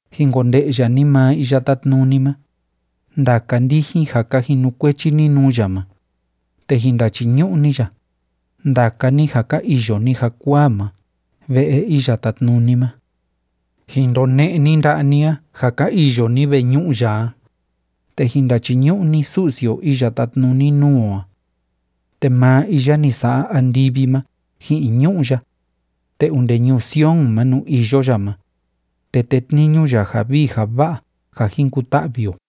Jin konde'ya ni maa Iya Tátnuni ma, ndaka ndijin ja ka jinukuechi ni nuu ya ma, te jin ndachiñu'u ni ya, ndaka ni ja ka iyo ni jakuaa ma ve'e Iya Tátnuni ma. Jin ndone'e ni nda'a ni a, ja ka iyo ni veñu'u ya a, te jin ndachiñu'u ni Su'si o iya tátnuni nuu o a. Te maa iya ni sa'a andivi ma ji'in ñu'ú ya, te onde ñuu Sion ma nuu iyo ya ma, te tétniñu ya ja vii ja va'a ja jin kuta'vi o.